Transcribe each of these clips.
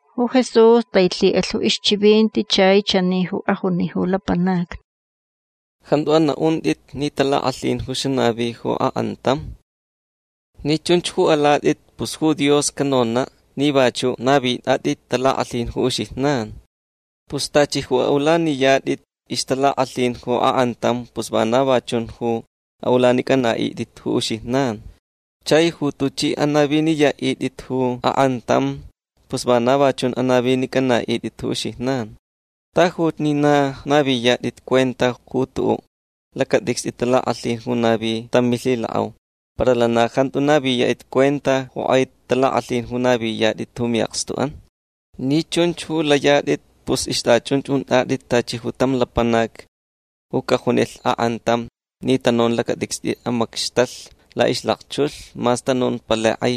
Ju Jesús tailhi'alh ju ixchivinti chai chani ju ajuni ju lapanacni: ―Jantu ana'unt'it ni talak'alhin ju xanavi ju ak'antam. Ni chunch ju alat'it pus ju Dios canona' ni vachu' navit'at'it talak'alhin ju uxijnan. Pus tachi ju ulaniyat'it ixtalak'alhin ju ak'antam pus vana va chun ju a'ulanic'ana'it'it ju uxijnan. Chai ju tuch'i anaviniya'it'it ju ak'antam pus vana va chun ju anavic'ana'it'it ju uxijnan. Tajuch ni na naviyat'it cuenta ju tu'u' lacat'icst'i talak'alhin ju navi tam milhilak'au para lana jantu naviyat'it cuenta ju k'ai talak'alhin ju naviyat'it mi'akstu'an. Ni chunch ju layat'it pus ixt'achunch unt'at'it tachi tam lapanac ju cajunilh ak'antam ni tanun ju lacat'icst'i amacxtalh la'ixlakchulh mas tanun ju palai k'ai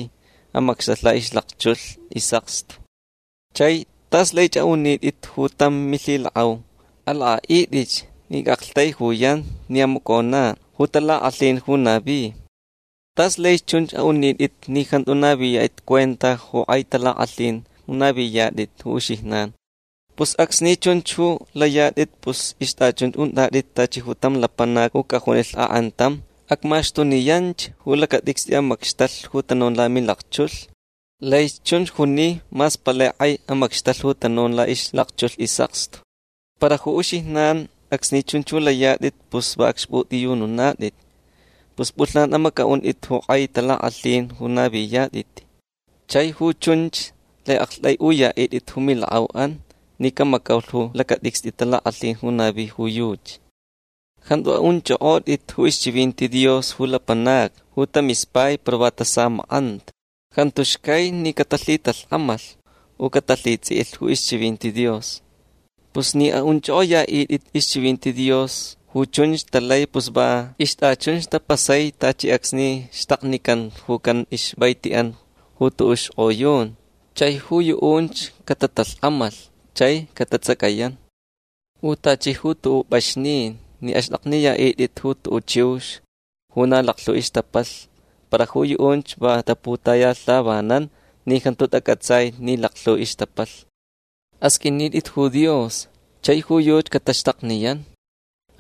amacxtalh la'ixlakchulh is'akstu. Chai tas laich a'unit'it ju tam milhilak'au: “Alak'a'it'ich ni ac'aktaijuyan ni amacona' ju talak'alhin ju navi”. Tas laich chunch a'unit'it ni jantu naviyat'it cuenta ju k'ai talak'alhin ju naviyat'it ju uxijnan. Pus acsni chunch ju layat'it pus ixt'achunch unt'at'it tachi tam lapanac ju cajunilh ak'antam: “Acmaxtuniyanch ju lacat'icst'i amacxtalh ju tanun lamilakchulh”. Laich chunch juni mas palai k'ai amacxtalh ju tanun la'ixlakchulh is'akstu. Para ju uxijnan acsni chunch ju layat'it pus va acxp'ut'iyununat'it. Pus p'ulhnan amac'a'unt'it ju k'ai talak'alhin ju naviyat'it. Chai ju chunch lai a'akt'ai'uya'it'it ju milak'au'an ni camacaulh ju lacat'icst'i talak'alhin ju navi ju yuchi. Jantu a'unch'ok'ot'it ju ixchivinti Dios ju lapanacni ju tamispai para va tasamak'anta. Jantu xcai ni catalhitalhk'amalh u catalhits'i'ilh ju ixchivinti Dios. Pus ni a'unch'ok'oya'it'it ixchivinti Dios ju chunch talai pus va ixt'achun tapasai tachi acsni xtaknican ju can ixvaiti'an ju tu'u' xk'oyun chai ju yu'unch catatalhk'amalh chai catats'acayan. U tachi ju tu'u' p'axnin ni axt'akniya'it'it ju tu'u' chiux ju na laklhu ixtapalh para ju yu'unch va taputayalhavanan ni jantu tac'atsai ni laklhu ixtapalh. Asq'uinit'it ju Dios chai ju yuchi cataxtakniyan.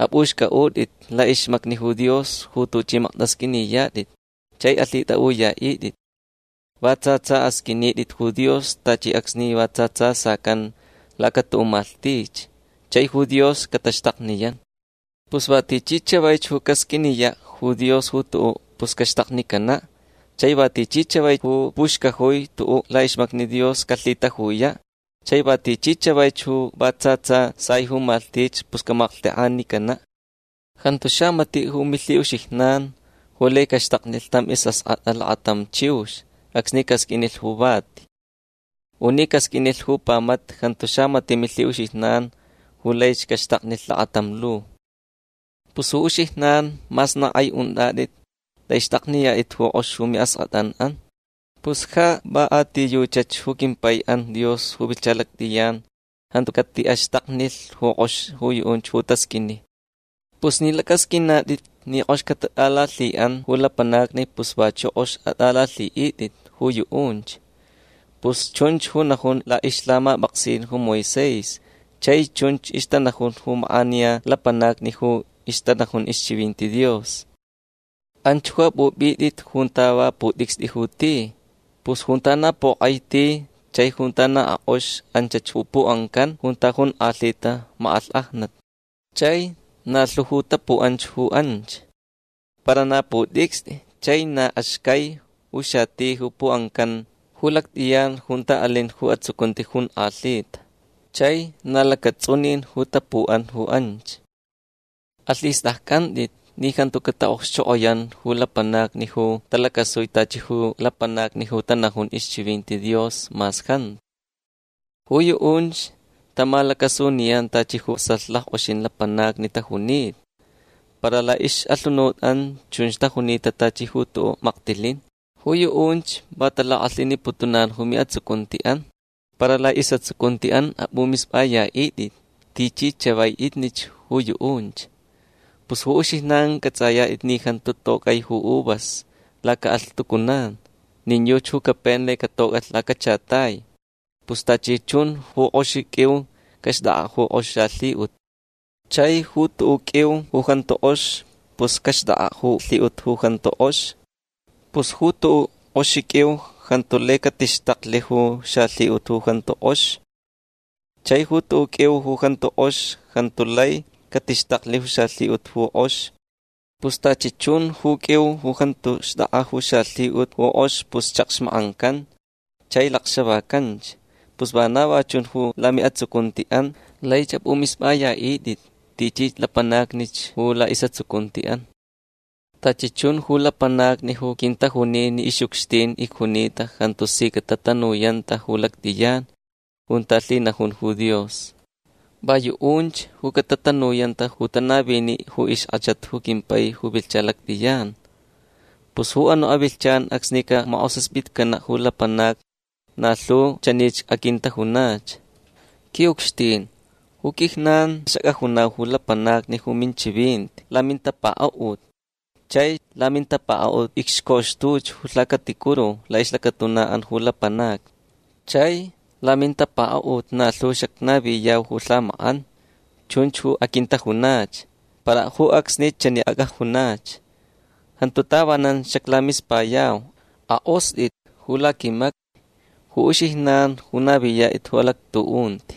Ap'uxc'a'ut'it la'ixmacni Dios ju tuch'i makt'asq'uiniyat'it chai alhit'a'uya'it'it. Va tsa tsa asq'uinit'it ju Dios tachi acsni va tsa tsa sacan laca tu'u' malhtich chai ju Dios cataxtakniyan. Pus va tichi chavaich ju casq'uiniya' ju Dios ju tu'u' pus caxtaknicana'. Chai va tichi chavaich ju puxcajui tu'u' la'ixmacni Dios calhitajuya'. Chai va tichi chavaich ju va tsa tsa sai ju malhtich pus camalhtek'anicana'. Jantu xamati' ju milhi'uxijnan ju lai caxtaknilh tam is'ask'at'a lakatam chiux acsni casq'uinilh ju vati. U ni casq'uinilh ju pamata jantu xamati' milhi'uxijnan ju laich caxtaknilh lakatam lu. Pus ju uxijnan mas na k'ai unt'at'it lai xt'akniyat'it ju k'ox ju mi'ask'at'an'an. Pus ja va a ti yuchach ju quimpai'an Dios ju vilhcha lact'iyan jantu cati'axtaknilh ju k'ox ju yu'unch ju tasq'uini. Pus ni lac'asq'uinat'it ni k'ox catat'alalhi'an ju lapanacni pus vachu' k'ox at'alalhi'it'it ju yu'unch. Pus chunch ju najun la'ixlhamap'aksin ju Moisés chai chunch ixtanajun ju mak'aniya lapanacni ju ixtanajun ixchivinti Dios. Anch ju ap'up'it'it junta va put'icst'i ju ti. Pus junta na pok'ai ti chai junta na ak'ox anchach ju pu'ancan junta jonk'alhita mak'alhk'ajnat. Chai na lhu ju tapu'anch ju anch. Para na put'icst'i chai na axcai ju xati ju pu'ancan ju lact'iyan junta alin ju atsucunti jonk'alhita. Chai na lacats'unin ju tapu'an ju anch. Alhist'acc'ant'it ni jantu cata'okxchok'oyan ju lapanacni ju talacasui tachi ju lapanacni ju tanajun ixchivinti Dios mas jantu. Ju yu'unch tamalacasuniyan tachi ju vasalh lack'oxin lapanacni tajunita. Para la'ix'alhunut'an chunch tajunita tachi ju tu'u' maktilin. Ju yu'unch va talak'alhiniputunan ju mi'atsucunti'an. Para la'is'atsucunti'an ap'umisp'aya'it'it tichi chava'itnich ju yu'unch. Pus ju uxijnan c'ats'ayat'it ni jantu toc'ai ju uvas laca'alhtucunan. Nin yuchi ju capen lai catoc'alh lacachatai. Pus tachi chun ju k'oxi q'uiu caxt'ak'a' ju k'ox xalhi'ut. Chai ju tu'u' q'uiu ju jantu k'ox pus caxt'ak'a' ju lhi'ut ju jantu k'ox. Pus ju tu'u' k'oxi q'uiu jantu lai catixtaklh ju xalhi'ut ju jantu k'ox. Chai ju tu'u' q'uiu ju jantu k'ox jantu lai catixtaklh ju xalhi'ut ju k'ox. Pus tachi chun ju q'uiu ju jantu xt'ak'a ju xalhi'ut ju k'ox pus chakxmak'ancan chai lakxavacanch. Pus vana va chun ju lami'atsucunti'an. Laich ap'umisp'aya'it'it tichi lapanacnich ju la'is'atsucunti'an. Tachi chun ju lapanacni ju quintajuni ni ix'ucxtin icjunita jantu si catatanuyanta ju lact'iyan junta lhinajun ju Dios. Va yu'unch ju catatanuyanta ju tanavini ju ixk'achat ju quimpai ju vilhcha lact'iyan. Pus ju anu' avilhchan acsni camak'osaspitcana' ju lapanacni na lhu chanich aquintajunach: “Qui'ucxtin ju quijnan xac'ajunau ju lapanacni ju minchivinti lamintapaka'ut. Chai lamintapaka'ut icxcoxtuch ju lhacaticuru la'ixlacatuna'an ju lapanacni. Chai lamintapaka'ut na lhu xacnaviyau ju lhamak'an”. Chunch ju aquintajunach. Para ju acsnich chani ac'ajunach: “Jantu tavanan xaclamispayau. Ak'ost'it ju laquimacni ju uxijnan ju naviyat'it ju alactu'unti”.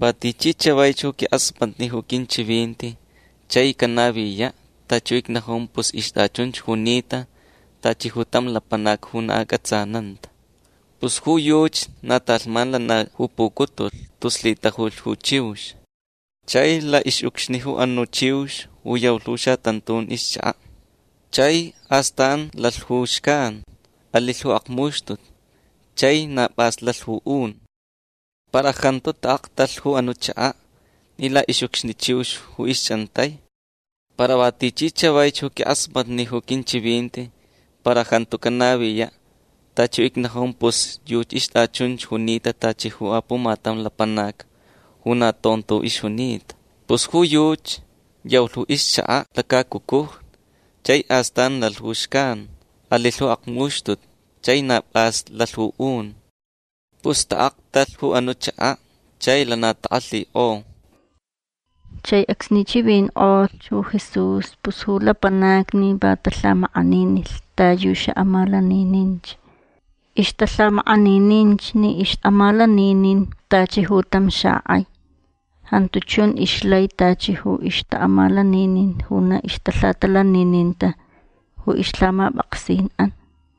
Va tichi chavaich ju quink'asmatni ju quinchivinti chai canaviya' tachi ju icnajun pus ixt'achunch junita tachi tam lapanac ju na ac'atsananta. Pus ju yuchi na talhman lana ju pucutulh tus lhitajulh ju chiux. Chai la'ix'ucxni ju anu' chiux ju yaulh ju xatantun ixchaka'. Chai astan lalh ju xcan. Alilh ju akmuxtutu. Chai na p'as lalh ju un. Para jantu ta'aktalh ju anu' chaka' ni la'ix'ucxni chiux ju ixch'antai. Para va tichi chavaich ju quink'asmatni ju quinchivinti para jantu canaviya' tachi ju icnajun pus ju yuchi ixt'achunch junita tachi ju apumatam lapanac ju na tonto ixjunita. Pus ju yuchi yaulh ixchaka' lacacucujni. Chai astan lalh ju xcan. Alilh ju akmuxtutu. Chai na p'as lalh ju un. Pus ta'aktalh ju anu' chaka' chai lana tak'alhik'o. Chai acsni chivink'olhch ju Jesús pus ju lapanacni va talhamak'aninilh ta yu xa'amalanininch. Ixtalhamak'anininch ni ix'amalaninin tachi ju tam xak'ai. Jantu chun ixlai tachi ju ixta'amalaninin ju na ixtalhatalanininta ju ixlhamap'aksin'an.